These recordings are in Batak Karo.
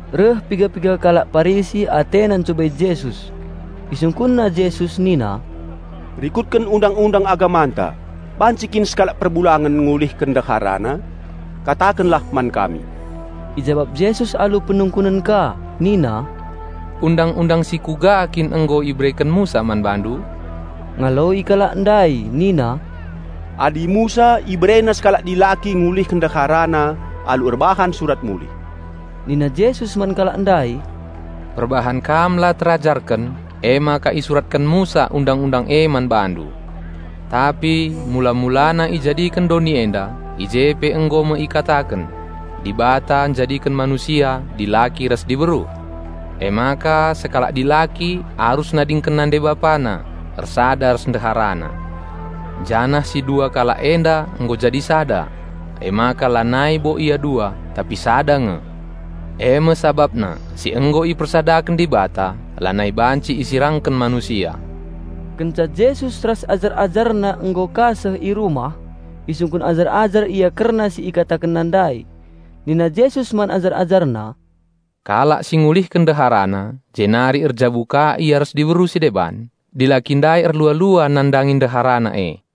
Reh piga-piga kalak Parisi atena ncubai Jesus. Isungkunna Jesus nina, "Rikutken Undang-undang agamanta, banci kin sekalak perbulangen ngulihken ndeharana? Katakenlah man kami!" Ijabap Jesus alu penungkunen ka nina, "Undang-undang si kuga kin nggo ibereken Musa man bandu?" Ngaloi kalak ndai nina, "Adi Musa iberena sekalak dilaki ngulihken ndeharana alu erbahan surat mulih." Nina Jesus man kalak ndai, "Perbahan kam la terajarken, emaka isuratken Musa Undang-undang e man bandu. Tapi mula-mulana ijadiken doni enda, i je pe nggo me ikataken, 'Dibata njadiken manusia dilaki ras diberu. Emaka sekalak dilaki arus nadingken nande bapana, ersada ras ndeharana, janah si dua kalak enda nggo jadi sada.' Emaka lanai bo ia dua tapi sada nge. E me sabapna si nggo ipersadaken Dibata, lanai banci isirangken manusia." Kenca Jesus ras ajar-AjarNa nggo ka seh i rumah, isungkun ajar-ajar Ia kerna si IkatakenNa ndai. Nina Jesus man ajar-AjarNa, "Kalak si ngulihken ndeharana, jenari erjabu ka ia ras diberu si deban, dilaki ndai erlua-lua nandangi ndeharana e.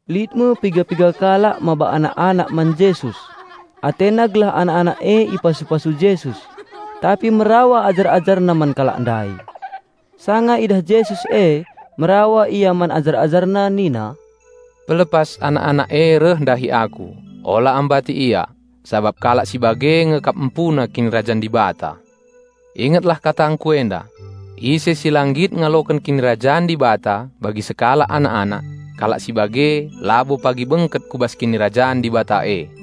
Lit me piga-piga kalak maba anak-anak man Jesus. Atena gelah anak-anak e ipasu-pasu Jesus, tapi merawa ajar-AjarNa man kalak ndai. Sanga idah Jesus e, merawa Ia man ajar-AjarNa nina, "Pelepas anak-anak e reh ndahi Aku, ola ambati ia, sabap kalak si bage nge kap empuna Kinirajan Dibata. Ingetlah katangKu enda! Ise si la nggit ngaloken Kinirajan Dibata bagi sekalak anak-anak, kalak si bage labo pagi bengket ku bas Kinirajan Dibata e."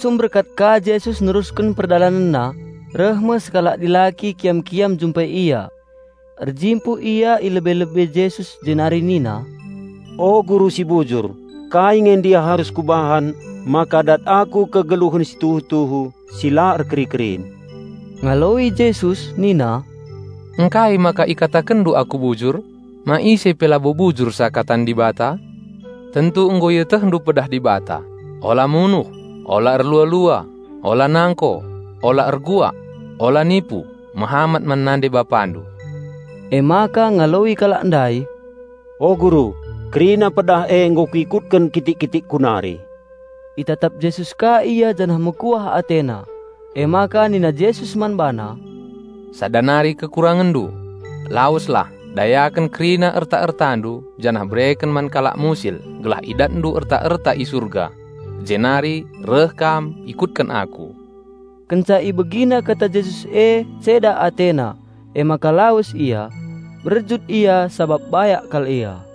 Asum berkat ka Jesus nerusken PerdalanenNa, reh me sekalak dilaki kiam-kiam njumpai Ia. Erjimpuh ia i lebe-lebe Jesus jenari nina, "O Guru si bujur, kai nge ndia arus kubahan maka kudat kegeluhen situhu-tuhu si la erkeri-kerin?" Ngaloi Jesus nina, "Ngkai maka ikatakenndu Aku bujur? Ma ise pe labo bujur seakatan Dibata? Tentu nggo ietehndu pedah Dibata, 'Ula munuh, ola erlua-lua, ola nangko, ola erbual, ola nipu, mehamat man nande bapandu.'" Emaka ngaloi kalak ndai, "O Guru, kerina pedah e nggo kuikutken kitik-kitikku nari." Itatap Jesus ka ia janah mekuah AteNa. Emaka nina Jesus man bana, "Sada nari kekurangenndu. Laweslah, dayaken kerina erta-ertandu janah bereken man kalak musil gelah idatndu erta-erta i surga; jenari reh kam, ikutken Aku." Kenca ibegina kata Jesus e ceda atena, emaka lawes ia. Berjut ia sabap bayak kal ia.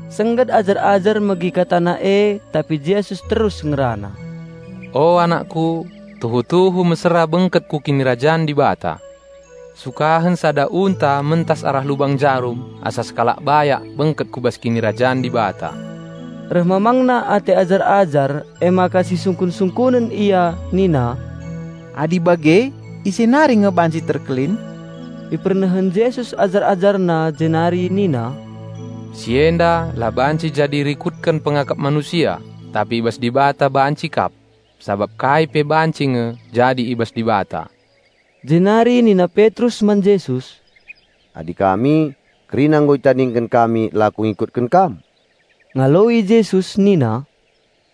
Sengget ajar-ajar megi KataNa e, tapi Jesus terus ngerana, "O anakKu, tuhu-tuhu mesera bengket ku Kinirajan Dibata. Sukahen sada unta mentas arah lubang jarum asa sekalak bayak bengket ku bas Kinirajan Dibata." Reh mamangna ate ajar-ajar, emaka sisungkun-sungkunen ia, nina, "Adi bage ise nari nge banci terkelin?" Ipernehen Jesus ajar-AjarNa, jenari nina, "Si enda la banci jadi rikutken pengakap manusia, tapi i bas Dibata banci kap. Sabap kai pe banci nge jadi i bas Dibata." Jenari nina Petrus man Jesus, "Adi kami, kerina nggo itadingken kami lako ngikutken Kam!" Ngaloi Jesus nina,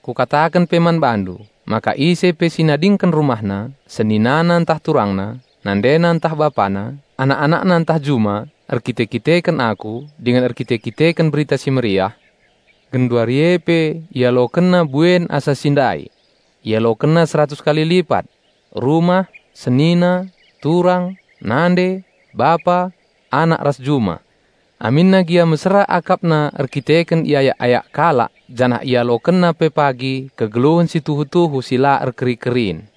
"Kukataken pe man bandu, maka ise pe si nadingken rumahna, seninana ntah turangna, nandena ntah bapana, anak-anakna ntah juma, erkite-kiteken Aku dingen erkite-kiteken Berita Si Mehuli, genduari e pe ialokenna buen asa si ndai. Ialokenna seratus kali lipat: rumah, senina, turang, nande, bapa, anak ras juma, aminna gia mesera akapna erkiteken iayak-ayak kalak janah ialokenna pe pagi kegeluhen si tuhu-tuhu si la erkeri-kerin.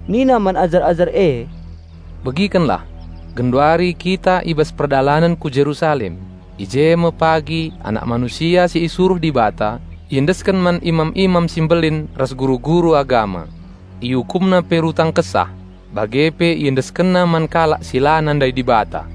Nina man ajar-ajar e, "Begikenlah! Genduari kita i bas perdalanen ku Jerusalem. I je me pagi Anak Manusia si isuruh Dibata iendesken man imam-imam si mbelin ras guru-guru agama. Iukumna pe rutang kesah. Bage pe iendeskenna man kalak si la nandai Dibata.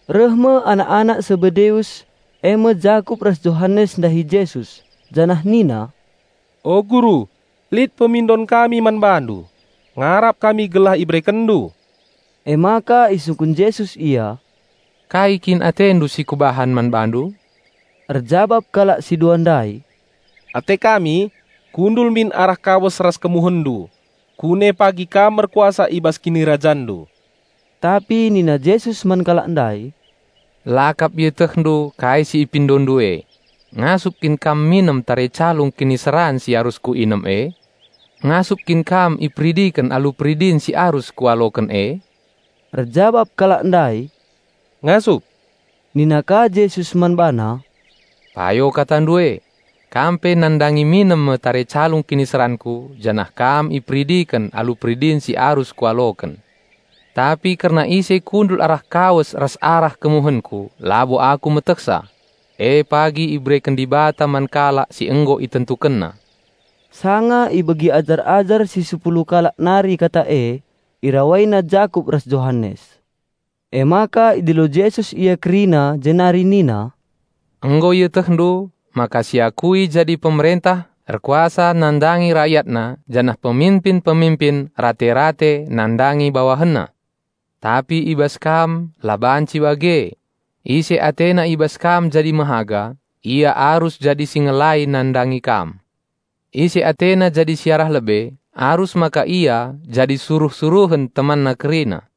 Reh me anak-anak Sebedeus e me Jakup ras Johanes ndahi Jesus, janah nina, "O Guru, lit pemindon kami man BaNdu, ngarap kami gelah IsehkenNdu." Emaka isungkun Jesus ia, "Kai kin atendu si Kubahan man bandu?" Erjabap kalak si dua ndai, "Ate kami kami min kundul arah kawes ras KemuhenNdu kune pagi Kam erkuasa i bas KinirajanNdu." Tapi nina Jesus man kalak ndai, "La kap ietehndu kai si ipindondu e. Ngasup kin kam minem tare calung kiniseran si arus Kuinem e? Ngasup kin kam iperidiken alu peridin si arus Kualoken e?" Erjabap kalak ndai, "Ngasup." Nina ka Jesus man bana, "Payo katandu e; kam pe nandangi minem me tare calung kiniseranKu janah kam iperidiken alu peridin si arus Kualoken. Tapi kerna ise kundul arah kawes ras arah kemuhenKu labo Aku metehsa. E pagi ibereken Dibata man kalak si nggo ItentukenNa." Sanga ibegi ajar-ajar si sepuluh kalak nari kata e, irawaina Jakup ras Johanes. Emaka idilo Jesus ia kerina jenari nina, "Nggo ietehndu maka si iakui jadi pemerentah erkuasa nandangi rakyatna janah peminpin-peminpin rate-rate nandangi bawahenna. Tapi i bas kam la banci bage. Ise atena i bas kam jadi mehaga, ia arus jadi si ngelai nandangi kam. Ise atena jadi si arah lebe, arus maka ia jadi suruh-suruhen temanna kerina.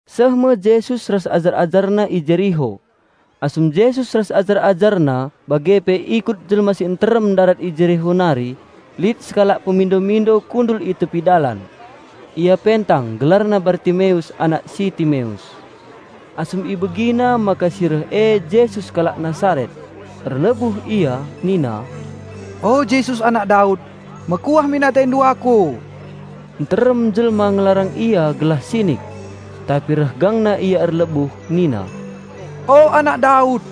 Seh me Jesus ras ajar-AjarNa i Jeriho. Asum Jesus ras ajar-AjarNa bage pe ikut jelma si nterem ndarat i Jeriho nari, lit sekalak pemindo-mindo kundul i tepi dalan. Ia pentang, gelarna Bartimeus anak si Timeus. Asum ibegina maka si reh e Jesus kalak Nasaret, erlebuh ia, nina, "O Jesus! Anak Daud! Mekuah min AteNdu aku!" Nterem jelma ngelarang ia gelah sinik. Tapi reh gangna ia erlebuh nina, "O Anak Daud!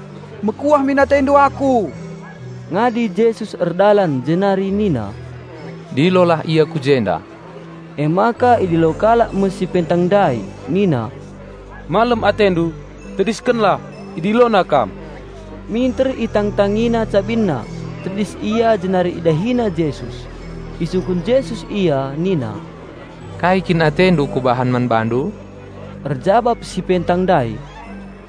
Mekuah min AteNdu aku!" Ngadi Jesus erdalan jenari nina, "Dilolah ia ku jenda!" Emaka idilo kalak me si pentang ndai nina, "Malem atendu! Tediskenlah! IdiloNa kam." Minter itangtangina cabinna, tedis ia jenari idahina Jesus. Isungkun Jesus ia nina, "Kai kin atendu Kubahan man bandu?" Erjabap si pentang ndai,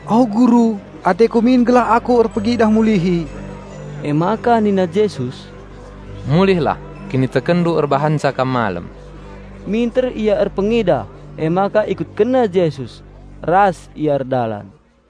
"O Guru, ateku min gelah aku erpengidah mulihi." Emaka nina Jesus, "Mulihlah, kinitekenndu erbahanca kam malem." Minter ia erpengidah, emaka ikutkenna Jesus, ras ia erdalan.